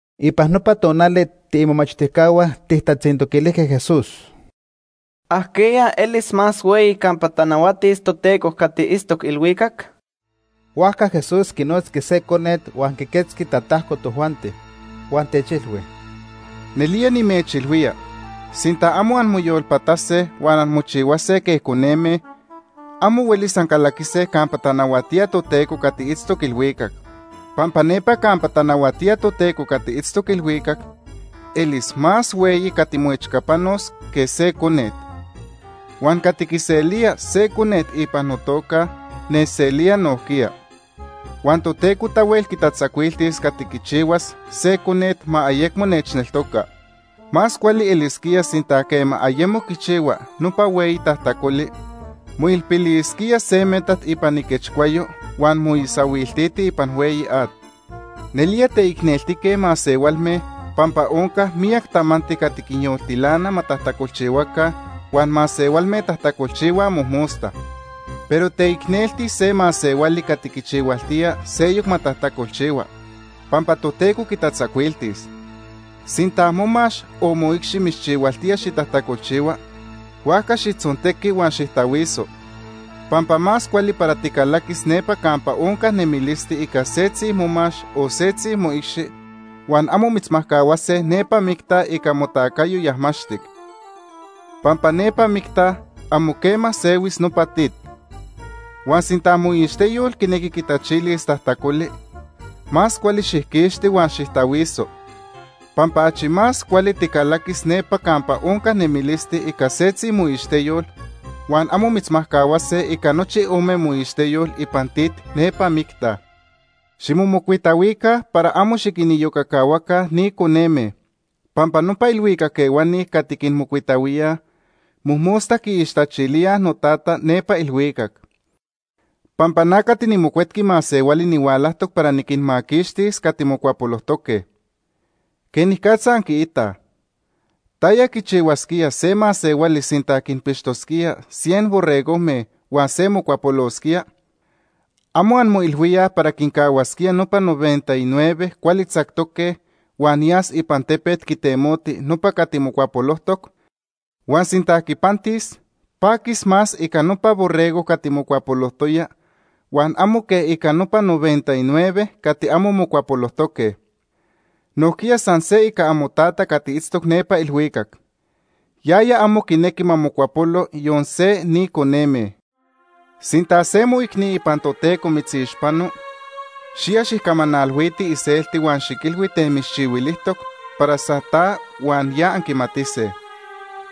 Ipan nopa tonali tiimomachtijcahua tijtatzintoquilijque Jesús: ―¿Ajquiya elis más hueyi campa tanahuatis Toteco cati itztoc ilhuicac? Huajca Jesús quinotzqui se conet huan quiquetzqui tatajco tojuanti, huan techilhui: ―Nelía nimechilhuía sinta amo anmoyolpatase huan anmochihuase quej coneme, amo huelis ancalaquise campa tanahuatía Toteco cati itztoc ilhuicac. Pampa nepa campa tanahuatía Toteco cati itztoc ilhuicac elis más hueyi cati moechcapanos quej se conet. Huan cati quiselía se conet ipan notoca O pampa nechneltoca. nechselía nojquiya. “Huan Toteco tahuel quitatzacuiltis cati quichihuas se conet ma ayecmo nechneltoca. Más cuali elisquía sinta quema ayemo quichihua nopa hueyi tajtacoli, moilpilisquía se metat ipan iquechcuayo huan moisahuiltiti ipan hueyi at. Nelía teicneltique masehualme pampa onca miyac tamanti cati quinyoltilana ma tajtacolchihuaca huan masehualme tajtacolchihuaj mojmosta. Pero teicnelti se masehuali cati quichihualtía seyoc ma tajtacolchihua, pampa Toteco quitatzacuiltis. “Sinta momax o moicxi mitzchihualtía xitajtacolchihua, huajca xijtzontequi huan xijtahuiso. Pampa más cuali para ticalaquis nepa campa onca nemilisti ica setzi momax o setzi moicxi, huan amo mitzmajcahuase nepa micta ica motacayo yajmaxtic. Pampa nepa micta amo quema sehuis nopa tit. Huan sinta moixteyol quinequi quitachilis tajtacoli, más cuali xijquixti huan xijtahuiso. Pampa achi más cuali ticalaquis nepa campa onca nemilisti ica setzi moixteyol huan amo mitzmajcahuase ica nochi ome moixteyol ipan tit nepa micta. “Ximomocuitahuica para amo xiquiniyocacahuaca ni coneme pampa nopa ilhuicac ehuani cati quinmocuitahuíaj, mojmosta quiixtachilíaj noTata nepa ilhuicac. Pampa na cati niMocuetqui Masehuali nihualajtoc para niquinmaquixtis cati mocuapolojtoque. “¿Quenicatza anquiitaj? ¿Taya quichihuasquía se masehuali sinta quinpixtoc cien borregojme huan se mocuapolosquía? ¿Amo anmoilhuíaj para quincahuasquía nopa noventa y nueve cuali tzactoque huan yas ipan tepet quitemoti nopa cati mocuapolojtoc? Huan sinta quipantis, paquis más ica nopa borrego cati mocuapolojtoya huan amo quej ica nopa noventa y nueve cati amo mocuapolojtoque. Nojquiya san se ica amoTata cati itztoc nepa ilhuicac. Yaya amo quinequi ma mocuapolo yon se ni coneme. “Sinta se moicni ipan Toteco mitzixpano, xiya xijcamanalhuiti iselti huan xiquilhui ten mitzchihuilijtoc para san ta huan ya anquimatise.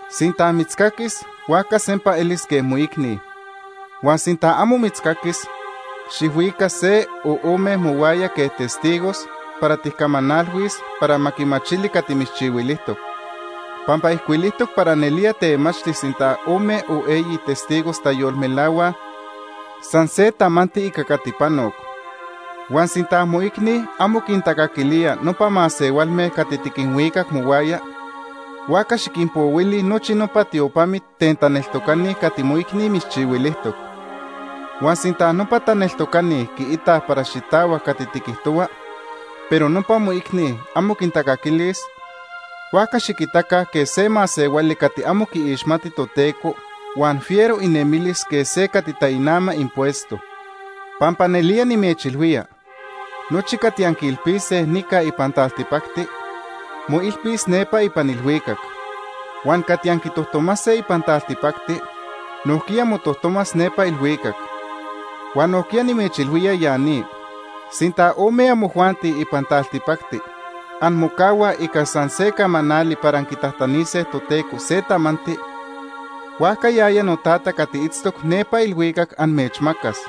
Sinta mitzcaquis huajca sempa elis quej moicni. Huan sinta amo mitzcaquis, xijhuica se o ome mohuaya quej testigos para tijcamanalhuis para ma quimachili cati mitzchihuilijtoc, pampa ijcuilijtoc para nelía temachti sinta ome o eyi testigos tayolmelahuaj san se tamanti ica cati panoc. Huan sinta moicni amo quintacaquilía nopa masehualme cati tiquinhuicac mohuaya, huajca xiquinpohuili nochi nopa tiopamit ten taneltocani cati moicni mitzchihuilijtoc. Huan sinta nopa taneltocani quiitaj para xitahuac cati tiquijtohua, pero nopa moicni amo quintacaquilis, huajca xiquitaca quej se masehuali cati amo quiixmati Toteco huan fiero inemilis quej se cati tainama impuesto. “Pampa nelía nimechilhuía, nochi cati anquiilpise nica ipan taltipacti, moilpis nepa ipan ilhuicac. Huan cati anquitojtomase ipan taltipacti nojquiya motojtomas nepa ilhuicac. “Huan nojquiya nimechilhuía ya ni, sinta ome amojuanti ipan taltipacti anmocahuaj ica san se camanali para anquitajtanise Toteco se tamanti, huajca yaya noTata cati itztoc nepa ilhuicac amechmacas.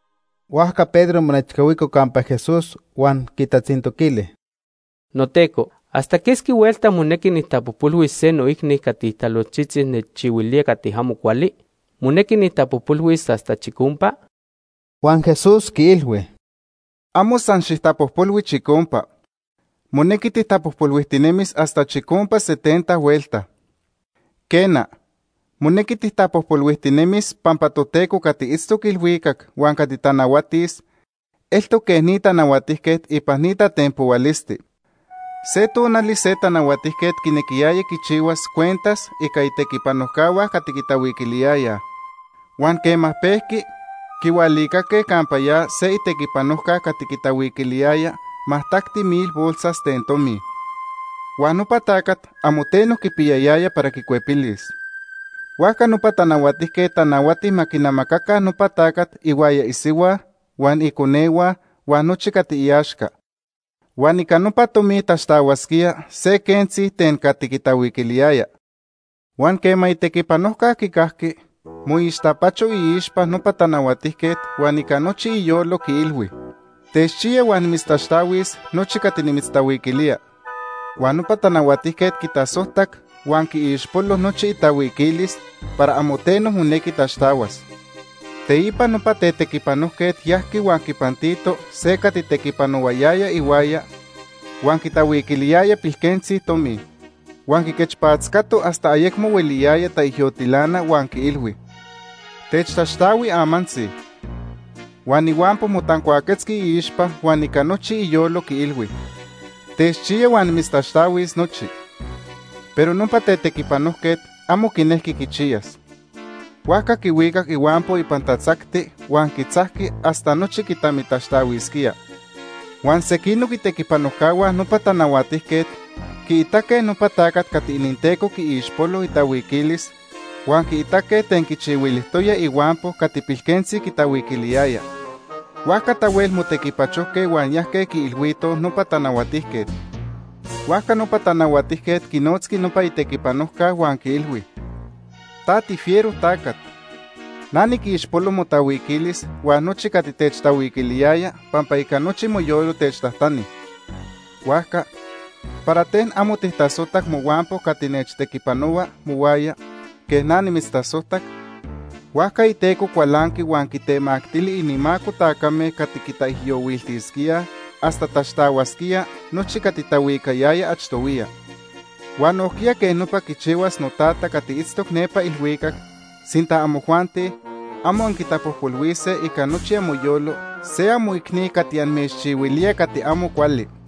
Huajca Pedro monechcahuico campa Jesús huan quitatzintoquili: ―NoTeco, ¿hasta quesqui huelta monequi nijtapojpolhuis se noicni cati talojtzitzi nechchihuilía cati amo cuali? ¿Monequi nijtapojpolhuis hasta chicompa? Huan Jesús quiilhui: ―Amo san xijtapojpolhui chicompa. Monequi tijtapojpolhuijtinemis hasta chicompa setenta huelta. “Quena, monequi tijtapojpolhuijtinemis pampa Toteco cati itztoc ilhuicac huan cati tanahuatis eltoc quej ni tanahuatijquet ipan ni tatenpohualisti. Se tonali se tanahuatijquet quinequiyaya quichihuas cuentas ica itequipanojcahua cati quitahuiquiliyayaj. Huan quema pejqui, quihualicaque campa ya se itequipanojca cati quitahuiquiliyaya majtacti mil bolsas ten tomi. Huan nopa tacat amo teno quipiyayaya para quicuepilis. Huajca nopa tanahuatijquet tanahuati ma quinamacaca nopa tacat ihuaya isihua huan iconehua huan nochi cati iaxca, huan ica nopa tomi taxtahuasquía se quentzi ten cati quitahuiquiliyaya. “Huan quema itequipanojca quicajqui, moixtapacho iixpa nopa tanahuatijquet huan ica nochi iyolo quiilhui: ‘Techchiya huan nimitztaxtahuis nochi cati nimitztahuiquilía.’ Huan nopa tanahuatijquet quitasojtac huan quiixpolo nochi itahuiquilis para amo teno monequi taxtahuas. “Teipa nopa tetequipanojquet yajqui huan quipantito se cati tequipanohuayaya ihuaya huan quitahuiquiliyaya pilquentzi tomi, huan quiquechpatzcato hasta ayecmo hueliyaya taijyotilana huan quiilhui: ‘Techtaxtahui amantzi.’ “Huan ihuampo motancuaquetzqui iixpa huan ica nochi iyolo quiilhui: ‘Techchiya huan nimitztaxtahuis nochi.’ “Pero nopa tetequipanojquet amo quinejqui quichiyas. Huajca quihuicac ihuampo ipan tatzacti huan quitzajqui hasta nochi quitamitaxtahuisquía. Huan sequinoc itequipanojcahua nopa tanahuatijquet quiitaque nopa tacat cati ininteco quiixpolo itahuiquilis huan quiitaque ten quichihuilijtoya ihuampo cati pilquentzi quitahuiquiliyaya. Huajca tahuel motequipachojque huan yajque quiilhuitoj nopa tanahuatijquet. “Huajca nopa tanahuatijquet quinotzqui nopa itequipanojca huan quiilhui: ‘Ta tifiero tacat. Na niquixpolo motahuiquilis huan nochi cati techtahuiquiliyaya pampa ica nochi moyolo techtajtani. Huajca ¿para ten amo tijtasojtac mohuampo cati nechtequipanohua mohuaya quej na nimitztasojtac?’ Huajca iteco cualanqui huan quitemactili inimaco tacame cati quitaijyohuiltisquíaj hasta taxtahuasquía nochi cati tahuicayaya achtohuiya. Huan nojquiya quej nopa quichihuas noTata cati itztoc nepa ilhuicac sinta amojuanti amo anquintapojpolhuise ica nochi amoyolo se amoicni cati amechchihuilía cati amo cuali.”